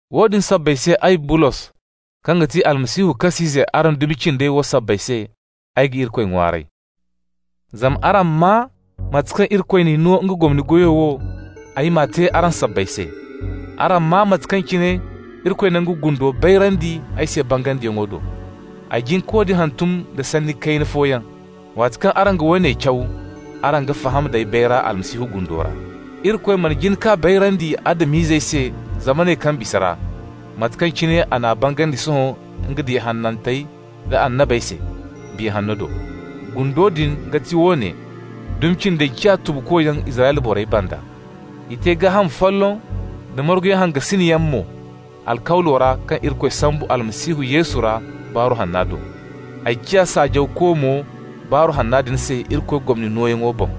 Woodin sabbay se ay, Bulos, kaŋ ga ti Almasihu kas'ize araŋ dumi cindey wo sabbay se, ay ga Irikoy ŋwaaray. Zama araŋ maa mate kaŋ Irikoy n'ay no nga gomni goyo wo ay m'a te araŋ sabbay se. Araŋ maa mate kaŋ cine Irikoy na nga gundo bayrandi ay se bangandiyaŋ do. Ay jin ka woodin hantum da sanni kayna fooyaŋ. Waati kaŋ araŋ ga woone caw, araŋ ga faham d'ay bayra Almasihu gundo ra. Irikoy mana jin k'a bayrandi Adam-izey se zamaney kaŋ bisa ra, mate kaŋ cine a n'a bangandi sohõ nga diya hanantey da annabey se, Biya Hanno do. Gundo din ga ti woone: dumi cindey ciya tubukoyaŋ Israyla borey banda. I te gaaham folloŋ da marguyaŋ hangasinyaŋ mo alkawlo ra kaŋ Irikoy sambu Almasihu Yesu ra Baaru Hanna do. Ay ciya saajawko mo Baaru Hanna din se Irikoy gomni nooyaŋo boŋ.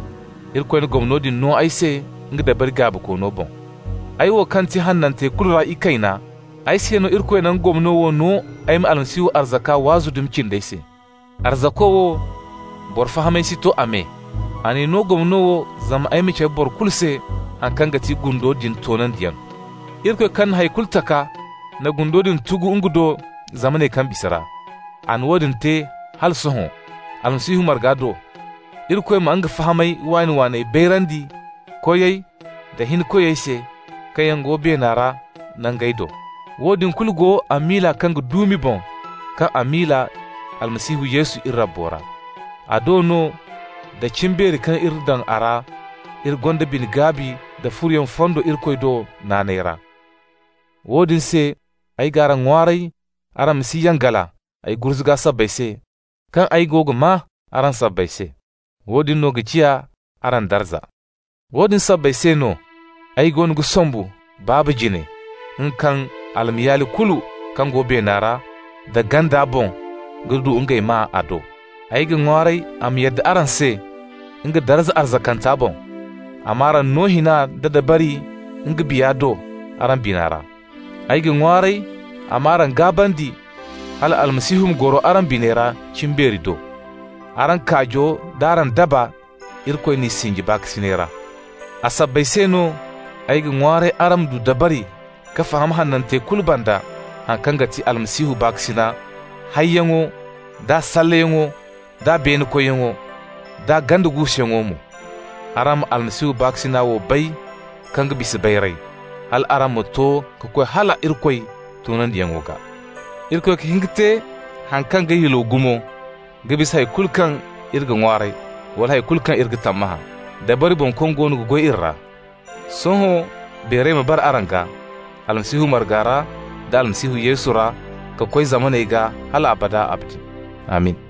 Irikoy na gomno din no ay se nga dabari gaabikoono boŋ. Ay wo kaŋ ti hanantey kulu ra ikayna, ay se no Irikoy na gomno wo no ay ma Almasihu arzaka waazu dumi cindey se. Arzako wo, boro fahamay si to a me. A n'ay no gomno wo zama ay ma cabe boro kulu se haŋ kaŋ ga ti gundo din toonandiyaŋ. Irikoy kaŋ na hay kulu taka na gundo din tugu nga do zamaney kaŋ bisa ra. A na woodin te hala sohõ, Almasihu marga do, Irikoy ma nga fahamay waani-waaney bayrandi koyey da hinkoyey se kaŋ yaŋ go beena ra nangey do. Woodin kulu go a miila kaŋ ga duumi boŋ kaŋ a miila Almasihu Yesu iri Rabbo ra. A do no, da cimbeeri kaŋ iri daŋ a ra, iri gonda bine-gaabi nda furoyaŋ fondo Irikoy do naanay ra. Woodin se ay g'araŋ ŋwaaray araŋ ma si yangala ay gurzuga sabbay se kaŋ ay go ga maa araŋ sabbay se. Woodin no ga ciya araŋ darza. Woodin sabbay se no ay goono ga sombu Baaba jine, nga kaŋ almayaali kulu kaŋ go beena ra da ganda boŋ ga du ngey maa a do. Ay ga ŋwaaray a ma yadda araŋ se, nga darza arzakanta boŋ, a m'araŋ no hina nda dabari nga Biya do araŋ bina ra. Ay ga ŋwaaray a m'araŋ gaabandi hala Almasihu ma goro araŋ biney ra cimbeeri do. Araŋ kaajo d'araŋ daba, Irikoy n'i sinji baakasinay ra. A sabbay se no ay ga ŋwaaray araŋ ma du dabari ka faham hanantey kulu banda haŋ kaŋ ga ti Almasihu baakasina hayyaŋo, d'a salleyaŋo, d'a beene kuuyaŋo, d'a ganda guusuyaŋo mo. Araŋ ma Almasihu baakasina wo bay, kaŋ ga bisa bayray, hal araŋ ma to ka koy hala Irikoy toonandiyaŋo gaa. Irikoy ga hin ka te haŋ kaŋ ga yulwa gumo ka bisa hay kulu kaŋ iri ga ŋwaaray wala hay kulu kaŋ iri ga tammahã, dabari boŋ kaŋ goono ga goy iri ra. Sohõ beeray ma bara a gaa, Almasihu marga ra da Almasihu Yesu ra ka koy zamaney gaa hal abada abadin. Amin!